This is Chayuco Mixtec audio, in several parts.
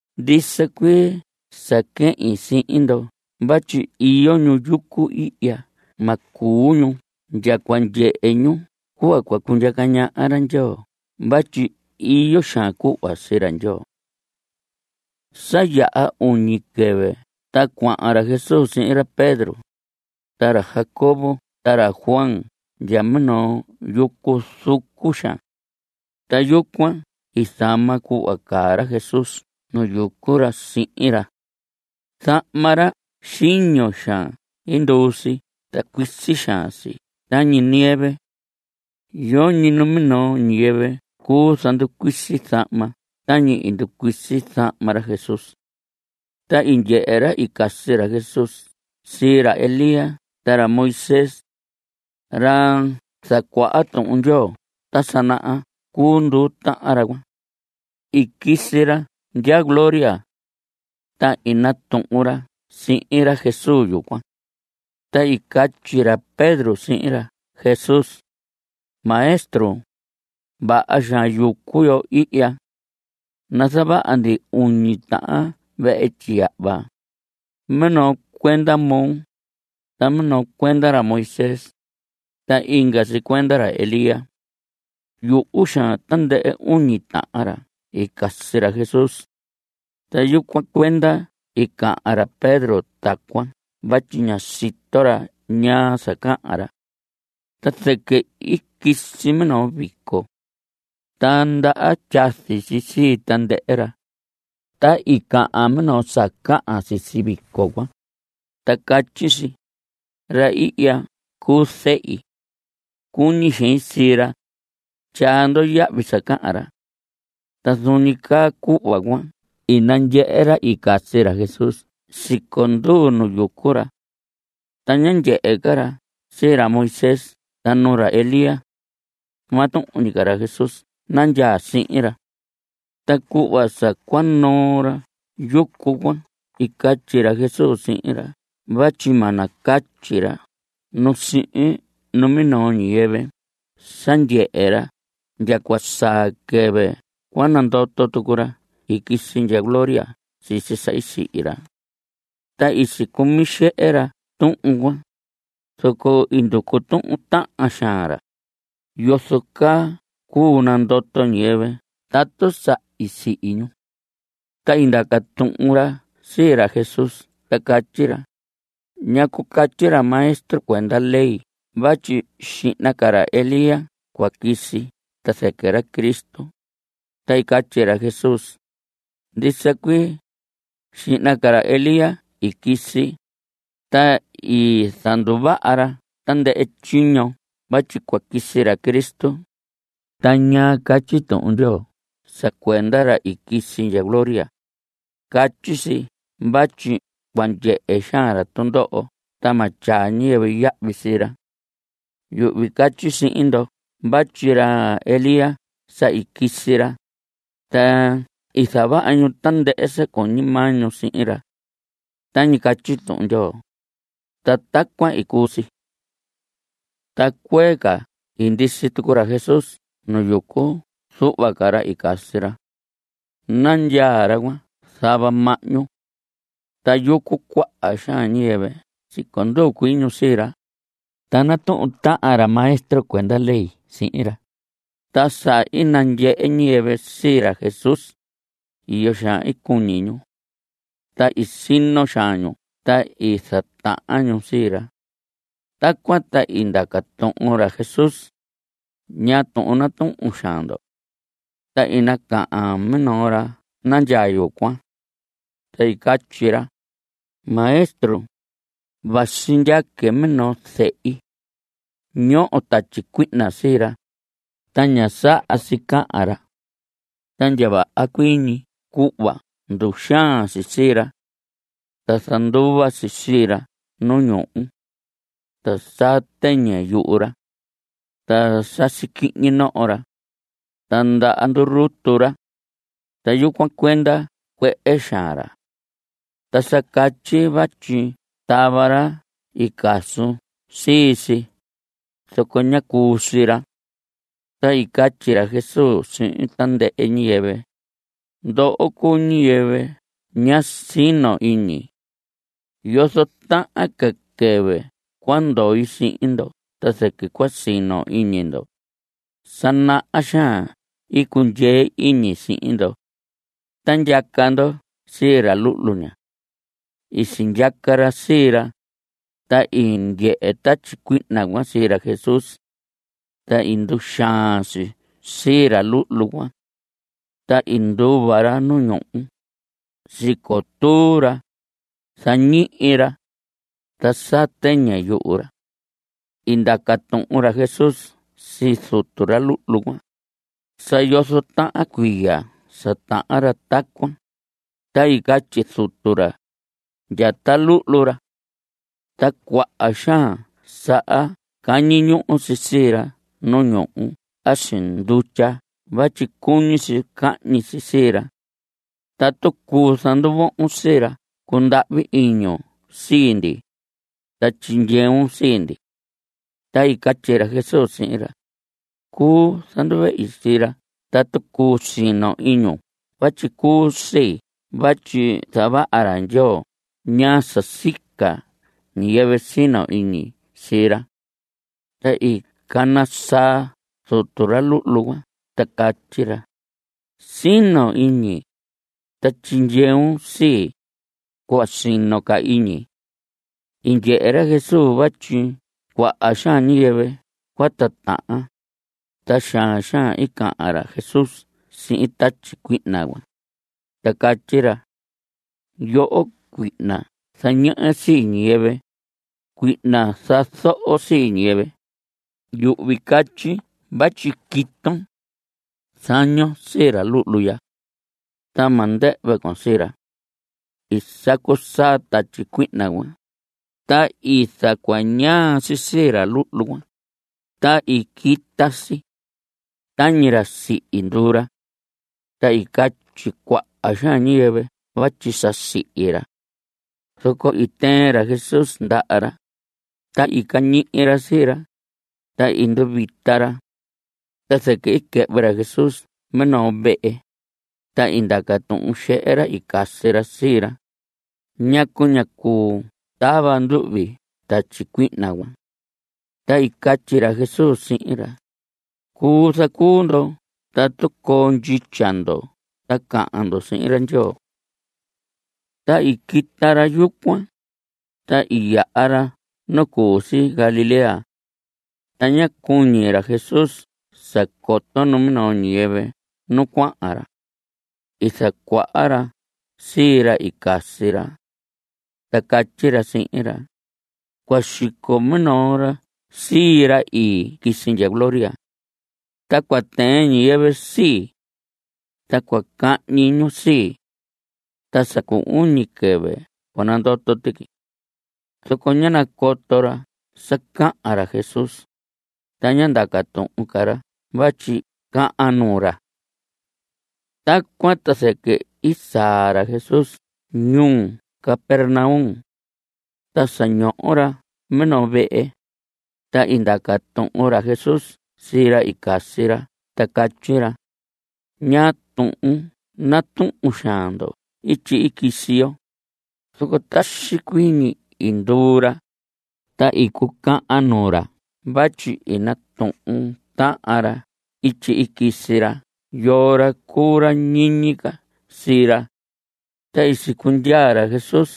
Ndisa cuii sa quehin sihin ndo vatyi iyo ñu yucu ihya ma cuu ñu ndya cua ndyehe ñu cuhva cundyaca ñaha ra Ndyoo vatyi iyo xaan cuhva sii ra Ndyoo. Sa yaha iñu quɨvɨ ta cuahan ra Jesús sihin ra Pedro, ta ra Jacobo ta ra Juan ndya minoo yucu zucu xaan. Ta yucuan i zama cuhva caa ra Jesús nu yucu ra sihin ra. Zahma ra xiño xaan i nduu si ta cuisi xaan si tañi nieve. Yoñi numinoo ñiyɨvɨ cuu zanducuisi zahma tañi i nducuisi zahma ra Jesús. Ta i ndyehe ra i casi ra Jesús sii ra Elías ta ra Moisés. Ra zacuaha Tuhun Ndyoo ta sa naha cuu nduu tahan ra cuan. I quisi ra ndya gloria. Ta i natuhun ra sihin ra Jesús yucuan. Ta i catyi ra Pedro sihin ra Jesús: Maestro, vaha xaan yucu yo ihya. Nazavaha ndi uñi tahan vehe tyiyahva; minoo cuenda moo, ta minoo cuenda ra Moisés, ta inga si cuenda ra Elías. Yuhu xaan tandɨhɨ uñi tahan ra i casi ra Jesús. Ta yucuan cuenda i cahan ra Pedro tacuan vatyi ñá sito ra ñaa sa cahan ra. Ta zɨquɨ i quisi minoo vico. Ta ndaha tyazi si sii tandɨhɨ ra. Ta i cahan minoo sa cahan sisi vico cuan. Ta catyi si: Ra ihya cuu zehi. Cuñi xein sii ra. Tyaa ndo yahvi sa cahan ra. Ta zuun ñi caa cuhva cuan i nandyehe ra i casi ra Jesús siconduu nu yucu ra. Ta ñá ndyehe ca ra sii ra Moisés ta nu ra Elías. Maa tuhun ñi ca ra Jesús nandyaa sihin ra. Ta cuhva sa cua noo ra yucu cuan i catyi ra Jesús sihin ra vatyi ma nacatyi ra nu sihin minoo ñiyɨvɨ sa ndyehe ra ndya cua saa quɨvɨ cua nandoto tucu ra i quisi ndya gloria sisi sa i sihi ra. Ta i sicumi xehe ra tuhun cuan, zoco i nducu tuhun tahan xaan ra: ¿Yozo caa cuu nandoto ñiyɨvɨ tatu sa i sihi ñu? Ta i ndaca tuhun ra sii ra Jesús ta catyi ra: ¿Ñacu catyi ra maestro cuenda ley vatyi xihna ca ra Elías cua quisi ta zɨquɨ ra Cristo? Ta i catyi ra Jesús: Ndisa cuii, xihna ca ra Elías i quisi, ta i zanduvaha ra tandɨhɨ tyiño vatyi cua quisi ra Cristo. Ta ¿ñaa catyi Tuhun Ndyoo sa cuenda ra i quisi ndya gloria? Catyi si vatyi cua ndyehe xaan ra tundoho ta ma tyaa ñiyɨvɨ yahvi sii ra. Yuhvi catyi sihin ndo vatyi ra Elías sa i quisi ra, ta i zavaha ñu tandɨhɨ sa cuñi maa ñu sihin ra. Tañi catyi Tuhun Ndyoo, ta tacuan i cuu si. Ta cuee ca i ndisi tucu ra Jesús nu yucu zuhva ca ra i casi ra. Nandyaa ra cuan zava mahñu. Ta yucu cuaha xaan ñiyɨvɨ siconduu cuii ñu sii ra. Ta natuhun tahan ra maestro cuenda ley sihin ra. Ta sa i nandyehe ñiyɨvɨ sii ra Jesús, iyo xaan i cuñi ñu. Ta i sino xaan ñu ta i zatahan ñu sii ra. Tacuan ta i ndaca tuhun ra Jesús: ¿Ñaa tuhun natuhun xaan ndo? Ta i nacahan minoo ra nandyaa yucuan. Ta i catyi ra: Maestro, vasi ndyaque minoo zehi. Ñoho tatyi cuihna sii ra. Ta ña saha si cahan ra. Ta ndya vaha cuii ñi cuhva nduxaan si sii ra. Ta zanduva si sii ra nu ñuhu. Ta saa tɨñɨ yuhu ra. Ta sasi quihñi noho ra. Ta ndaha ndurutu ra. Ta yucuan cuenda cuehe xaan ra. Ta sa catyi vatyi tava ra i casun sii si. Zoco ñá cuu sii ra. Ta i catyi ra Jesús sihin tandɨhɨ ñiyɨvɨ: Ndoho cuu ñiyɨvɨ ña sino iñi. ¿Yozo tahan ca quɨvɨ cua ndoi sihin ndo ta zɨquɨ cua sino iñi ndo? Sa naha xaan i cundyee iñi sihin ndo. Ta ndyaca ndo sii ra luhlu ña. I sindyaca ra sii ra, ta i ndyehe tatyi cuihna cuan sii ra Jesús. Ta i nduxaan si sii ra luhlu cuan. Ta i nduva ra nu ñuhu. Sicotuu ra. Zañihi ra. Ta saa tɨñɨ yuhu ra. I ndaca tuhun ra Jesús sii zutu ra luhlu cuan: ¿Sa yozo tahan cuiya sa tahan ra tacuan? Ta i catyi zutu ra: Ndya ta luhlu ra. Ta cuaha xaan saha cañi ñuhu si sii ra nu ñuhu a si ndutya vatyi cuñi si cahñi si sii ra. Tatu cuu zanduvohon sii ra cundahvi iñun sii ndi, ta tyindyeun sii ndi. Ta i catyi ra Jesús sihin ra: Cuu zanduvehi sii ra tatu cuu sino iñun vatyi cuu sii vatyi zavaha ra Ndyoo ñaa sa sica ñiyɨvɨ sino iñi sii ra. Ta i cana saa zutu ra luhlu cuan ta catyi ra: ¡Sino iñi, ta tyindyeun sii, cuhva sino ca iñi! I ndyehe ra Jesús vatyi cuaha xaan ñiyɨvɨ cua titahan, ta xaan xaan i cahan ra Jesús sihin tatyi cuihna cuan, ta catyi ra: Yoho cuihna zañehe sii ñiyɨvɨ, cuihna zazoho sii ñiyɨvɨ, yuhvi catyi vatyi quiton. Zañon sii ra luhlu ya. Ta ma ndɨhvɨ con sii ra. I sacu saa tatyi cuihna cuan, ta i zacuñaa si sii ra luhlu cuan, ta i quita si. Tañi ra sihi nduu ra. Ta i catyi cuaha xaan ñiyɨvɨ vatyi sa sihi ra. Zoco i tɨɨn ra Jesús ndaha ra, ta i cañihi ra sii ra, ta i nduvita ra. Ta zɨquɨ i quɨhvɨ ra Jesús minoo vehe, ta i ndaca tuhun xehe ra i casi ra sii ra: ¿Ñacu ñá cuu tava nduhvi tatyi cuihna cuan? Ta i catyi ra Jesús sihin ra: Cuu zacuu ndo tatu coo ndyitya ndo ta cahan ndo sihin ra Ndyoo. Ta i quita ra yucuan, ta i yaha ra nu cu si Galilea. Ta ñá cuñi ra Jesús sa coto numinoo ñiyɨvɨ nu cuahan ra. I zacuaha ra sii ra i casi ra, ta catyi ra sihin ra: Cua xico minoo ra sii ii, ra i quisi ndya gloria. Ta cua tɨɨn ñiyɨvɨ sii. Ta cua cahñi ñu sii. Ta sa cu uñi quɨvɨ cua nandoto tuqui. Zoco ñá nacoto ra sa cahan ra Jesús, ta ñá ndaca tuhun ra vatyi cahan nuu ra. Tacuan ta zɨquɨ i saa ra Jesús ñuu Capernaum. Ta sa ñoho ra minoo vehe, ta i ndaca tuhun ra Jesús sii ra i casi ra ta catyi ra: ¿Ñaa tuhun natuhun xaan ndo ityi i quisi yo? Zoco taxi cuii ñi i nduu ra. Ta i cucahan nuu ra vatyi i natuhun tahan ra ityi i quisi ra yoo ra cuu ra ñiñi ca sii ra. Ta i sicundyaa ra Jesús,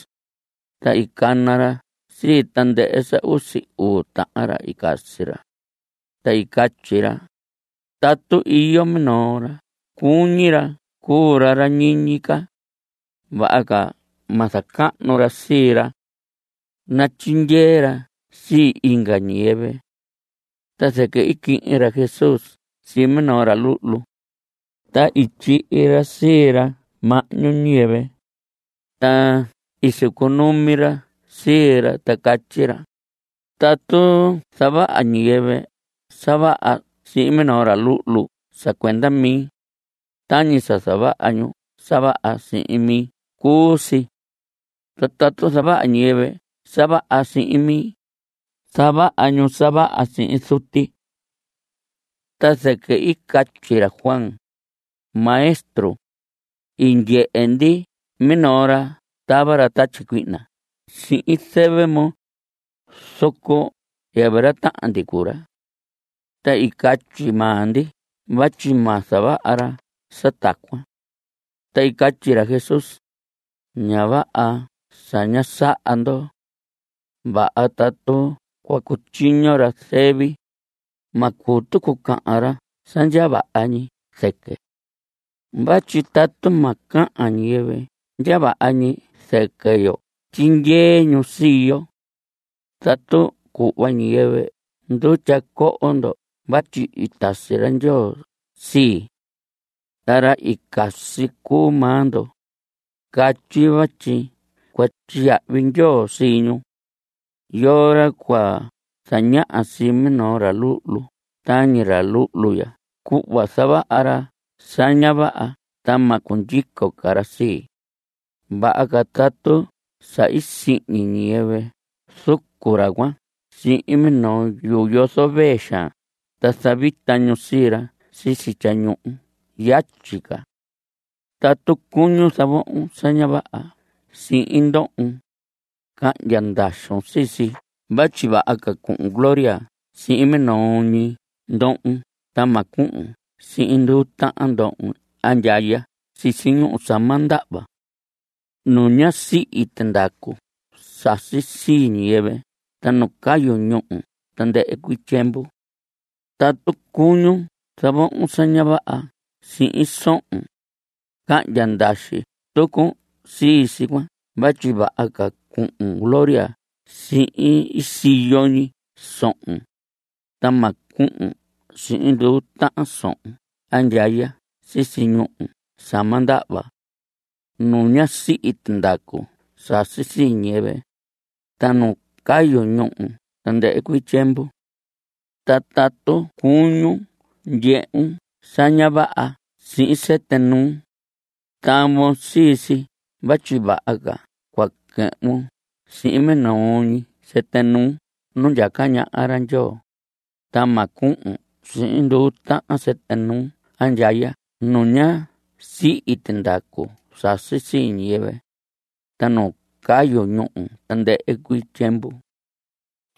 ta i cana ra sii tandɨhɨ sa usi uu tahan ra i casi ra, ta i catyi ra: Tatu iyo minoo ra cuñi ra cuu ra ra ñiñi ca, vaha ca ma zacahnu ra sii ra. Natyindyee ra sii inga ñiyɨvɨ. Ta zɨquɨ i quihin ra Jesús sii minoo ra luhlu, ta i tyihi ra sii ra mahñu ñiyɨvɨ, ta i sicunumi ra sii ra, ta catyi ra: Tatu zavaha ñiyɨvɨ sa vaha sihin minoo ra luhlu sa cuenda mi, tañi sa zavaha ñu sa vaha sihin mi cuu si. Ta tatu zavaha ñiyɨvɨ sa vaha sihin mi, zavaha ñu sa vaha sihin Zuti. Ta zɨquɨ i catyi ra Juan: Maestro, i ndyehe ndi minoo ra tava ra tatyi cuihna sihin zɨvɨ moo, zoco yɨvɨ ra tahan ndi cuu ra. Ta i catyi maa ndi vatyi ma zavaha ra sa tacuan. Ta i catyi ra Jesús: Ña vaha sa ñá saha ndo. Vaha tatu cua cutyiño ra zɨvi; ma cuu tucu cahan ra sa ndya vaha ñi zɨqui. Vatyi tatu ma cahan ñiyɨvɨ ndya vaha ñi zɨquɨ yo, tyindyee ñu sii yo. Tatu cuhva ñiyɨvɨ ndutya cohon ndo vatyi i tasi ra Ndyoo sii, ta ra i casi cuu maa ndo, catyi vatyi cua tyiyahvi Ndyoo sii ñu. Yoo ra cua zañaha sii minoo ra luhlu tañi ra luhlu ya cuhva zavaha ra sa ña vaha ta ma cundyico ca ra sii, vaha ca tatu sa i sihñi ñiyɨvɨ zucu ra cuan sihin minoo yuu yozo vee xaan ta zavita ñu sii ra sisi tyañuhu yatyi ca. Tatu cuñun zavohon sa ña vaha sihin ndohon, cahndya ndaxun sii si vatyi vaha ca cuhun gloria sihin minoo ñi ndohon ta ma cuhun sihin nduu tahan ndohon andyaya sisi ñuhu sa ma ndahva nu ña sihi tindacu sasi sii ñiyɨvɨ ta nu cayu ñuhu tandɨhɨ cuii tyiemvu. Tatu cuñun zavohon sa ña vaha sihin sohon, cahndya ndaxi tucun sii si cuan vatyi vaha ca cuhun gloria sihin ii siyo ñi sohon, ta ma cuhun sihin nduu tahan sohon andyaya sisi ñuhu sa ma ndahva nu ña sihi tindacu sasi sii ñiyɨvɨ, ta nu cayu ñuhu tandɨhɨ cuii tyiemvu. Ta tatu cuñun ndyehun sa ña vaha sihin sɨtɨ nuun, tavon sii si vatyi vaha ca cua quɨhvun sihin minoo ñi sɨtɨ nuun nu ndyaca ñaha ra Ndyoo, ta ma cuhun sihin nduu tahan sɨtɨ nuun andyaya nu ña sihi tindacu sasi sii ñiyɨvɨ, ta nu cayu ñuhu tandɨhɨ tyiemvu.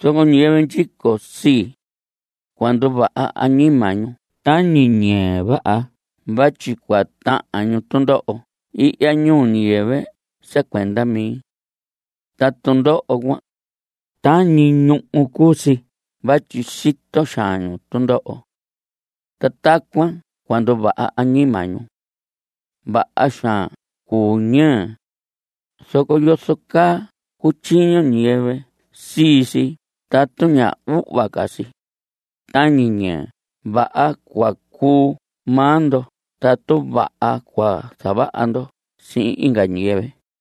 Zoco ñiyɨvɨ ndyico sii, cua nduvaha añima ñu tañi ñɨɨ vaha vatyi cua tahan ñu tundoho ihya ñuu ñiyɨvɨ sa cuenda mi. Ta tundoho cuan, tañi ñuhu cuu si vatyi sito xaan ñu tundoho. (Ta tacuan cua nduvaha añima ñu.) Vaha xaan cuu ñɨɨ, zoco ¿yozo caa cutyiño ñiyɨvɨ sii si tatu ña uhva ca si? Tañi ñɨɨ vaha cua cuu maa ndo tatu vaha cua zavaha ndo sihin inga ñiyɨvɨ.